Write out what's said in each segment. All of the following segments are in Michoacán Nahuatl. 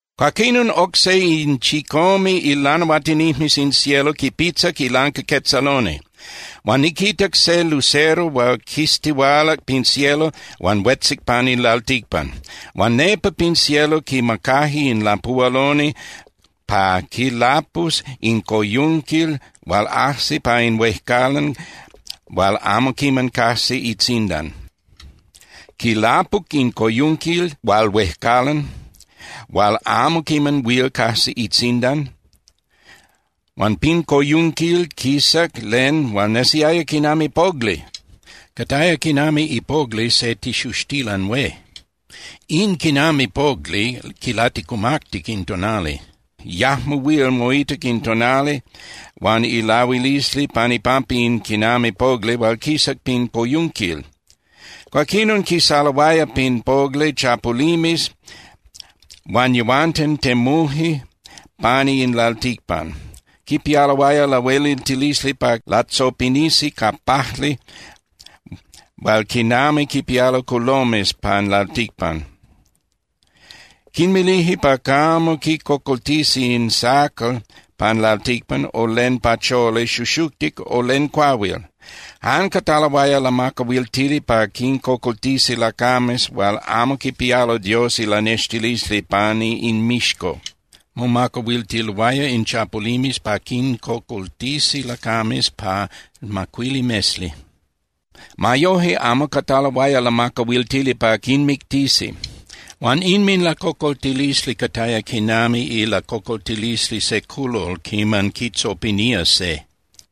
Cuaquinon oc se in chicome ilanahuatinijmes in cielo quipitzac ilancaquetzaloni, huan niquitac se lucero hual quistihualac pin cielo huan huetzic pan in lalticpan. Huan nepa pin cielo quimacaje in lapuhualoni pa quilapus in coyunquil hual ajsi pa in huejcalan hual amo quiman cajsi itzindan. Quilapuc in coyunquil hual huejcalan hual amo quiman huil cajsi itzindan, huan pin coyunquil quisac len hual nesiaya quinami pogli, cataya quinami ipogli se tixuxtilan hué. In quinami pogli quilaticumactic in tonali. Yajmo huil moitac in tonali huan ilahuilisli pan ipampa in quinami pogli hual quisac pin coyunquil. Cuaquinon quisaloaya pin pogli chapulimes huan yehuanten temuje pani in lalticpan. Quipialoaya lahueliltilisli pa latzopinisi ca pajli hual quinami quipialo culomes pan lalticpan. Quinmilije pa camo quicocoltisi in sacal pan lalticpan o len pacholi xuxuctic o len cuahuil. Jan cataloaya lamacahuiltili pa quincocoltisi lacames hual amo quipialoaya Dios ilanextilisli pani inmixco. Momacahuiltiloaya in chapulimes pa quincocoltisi lacames pa macuili mesli. Ma yoje, amo cataloaya lamacahuiltili pa quinmictisi. Huan inminlacocoltilisli cataya quinami ilacocoltilisli se culol quiman quitzopinía se.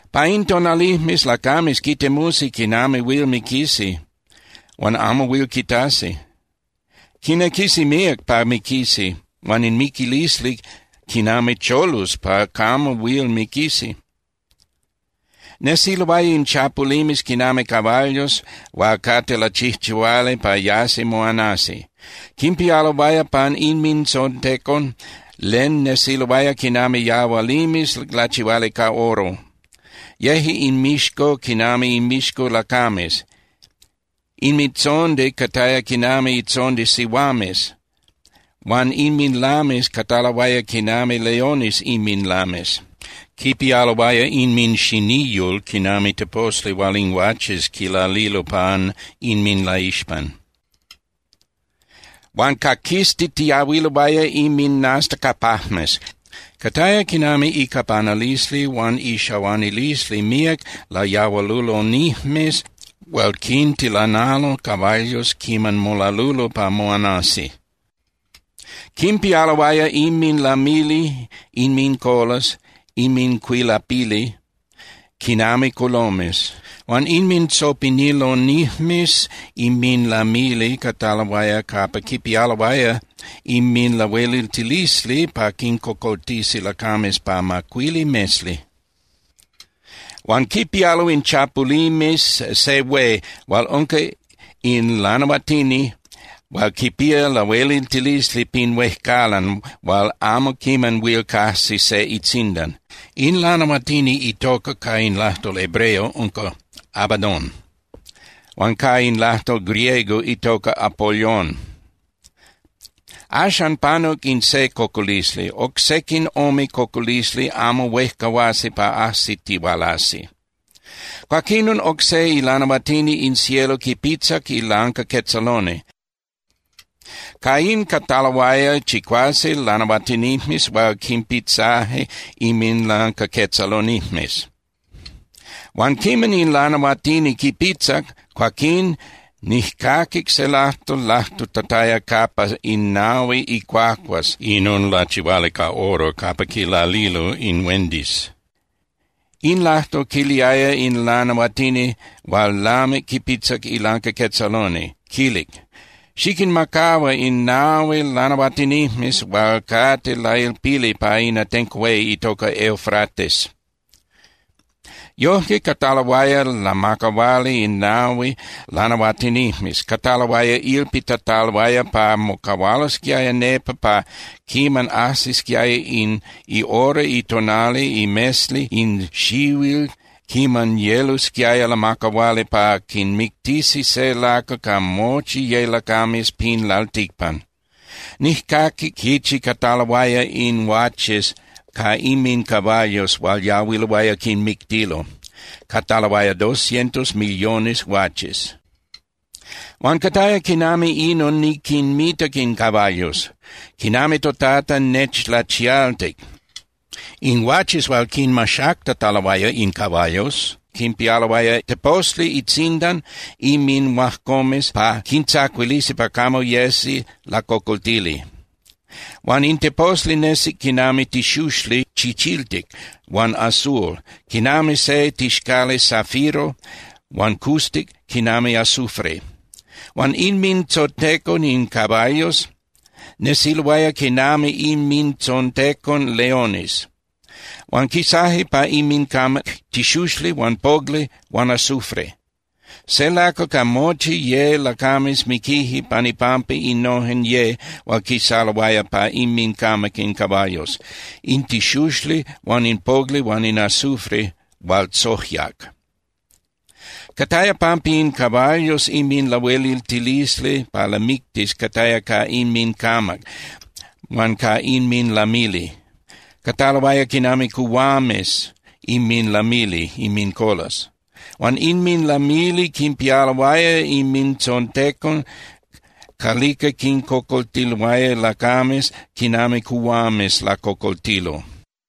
Pa in tonalijmes lacames quitemusi quinami huil miquisi huan amo huil quitasi. Quinequisi míac pa miquisi huan in miquilisli quinami cholus pa camo huil miquisi. Nesiloaya in chapulimes quinami caballos hual cate lachijchihuali pa yasi moanasi. Quimpialoaya pan inmintzontecon len nesiloaya quinami yahualimes lachihuali ca oro. Yeje inmixco quinami inmixco lacames. Inmintzondi cataya quinami itzondi sihuames huan inminlames cataloaya quinami leones inminlames. Quipialoaya inminxiniyul quinami teposli hual in guaches quilalilo pan inminlaixpan. Huan caquiztitiahuiloaya inminastacapajmes. Cataya quinami icapanalisli huan ixahuanilisli míac layahualulonijmes hual quintilanalo caballos quiman molalulo pa moanasi. Quimpialoaya inminlamili (inmincolas, inmincuilapili) quinami culomes, huan inmintzopinilonijmes inminlamili cataloaya capa quipialoaya inminlahueliltilisli pa quincocoltisi lacames pa macuili mesli. Huan quipialo in chapulimes se hué hual unca in lanahuatini hual quipía lahueliltilisli pin huejcalan hual amo quiman huil cajsi se itzindan. In lanahuatini itoca ca in lajtol hebreo unca Abadón huan ca in lajtol griego itoca Apolyón. Axan panuc in se cocolisli. Oc sequin ome cocolisli amo huejcahuasi pa ajsitihualasi. Cuaquinon oc se ilanahuatini in cielo quipitzac ilancaquetzaloni, ca in cataloaya chicuase lanahuatinijmes hual quinpitzaje inminlancaquetzalonijmes. Huan quiman in lanahuatini quipitzac, cuaquín nijcaquic se lajtol lajtutataya capa in nahui icuacuas inon lachihuali ca oro capa quilalilo in huendis. In lajtol quiliaya in lanahuatini hual lamic quipitzac ilancaquetzaloni, quilic: —Xiquinmacahua in nahui lanahuatinijmes hual cate lailpili pa in atenco hué itoca Eufrates. Yojque cataloaya lamacahuali in nahui lanahuatinijmes. Cataloaya ilpitataloaya pa mocahualosquiaya nepa pa quiman ajsisquiaya in ihora itonali imesli in xihuil quiman yelosquiaya lamacahuali pa quinmictisi se lacal ca mochi ye lacames pin lalticpan. Nijcaquic quichi cataloaya in guaches ca inmincaballos hual yahuiloaya quinmictilo. Cataloaya dos cientos millones guaches. Huan cataya quinami inon niquinmitac in caballos, quinami toTata nechlachialtic. In guaches hual quinmaxactataloaya in caballos quinpialoaya teposli itzindan inminhuajcomes pa quintzacuilisi pa camo yesi lacocoltili. Huan in teposli nesic quinami tixuxli chichiltic huan azul, quinami se tixcali zafiro huan custic quinami azufre. Huan inmintzontecon in caballos nesiloaya quinami inmintzontecon leones. Huan quisaje pa inmincamac tixuxli huan pogli huan azufre. Se lacal ca mochi ye lacames miquije pan ipampa innojen ye hual quisaloaya pa inmincamac in caballos: in tixuxli huan in pogli huan in azufre hual tzojyac. Cataya pampa in caballos inminlahueliltilisli pa lamictis cataya ca inmincamac huan ca inminlamili. Cataloaya quinami cuhuames inminlamili (inmincolas). Huan inminlamili quinpialoaya inmintzontecon calica quincocoltiloaya lacames quinami cuhuames lacocoltilo.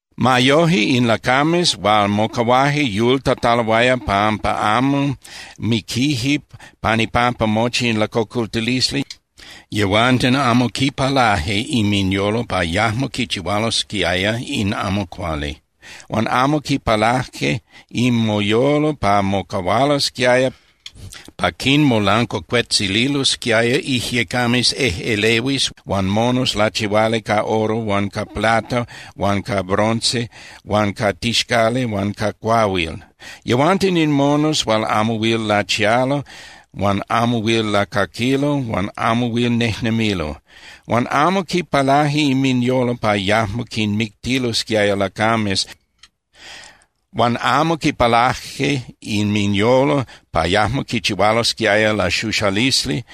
Ma yoje, in lacames hual mocahuaje yultataloaya pampa amo miquije pan ipampa mochi in lacocoltilisli, yehuanten amo quipalaje inminyolo pa yajmo quichihualosquiaya in amo cuali. Huan amo quipalaje inminyolo pa mocahualosquiaya pa quinmolancuacuetzililosquiaya ijyecames ejꞌelehuis huan monos lachihuali ca oro huan ca plata huan ca bronce huan ca tixcali huan ca cuahuil. Yehuanten in monos hual amo huil lachialo huan amo huil lacaquilo huan amo huil nejnemilo. Huan amo quipalaje inminyolo pa yajmo quinmictilosquiaya lacames huan amo quipalaje inminyolo pa yajmo quichihualosquiaya laxuxalisli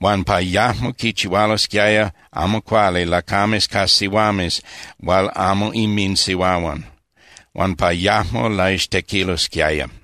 huan pa yajmo quichihualosquiaya amo cuali lacames ca sihuames hual amo inminsihuahuan, huan pa yajmo laixtequilosquiaya.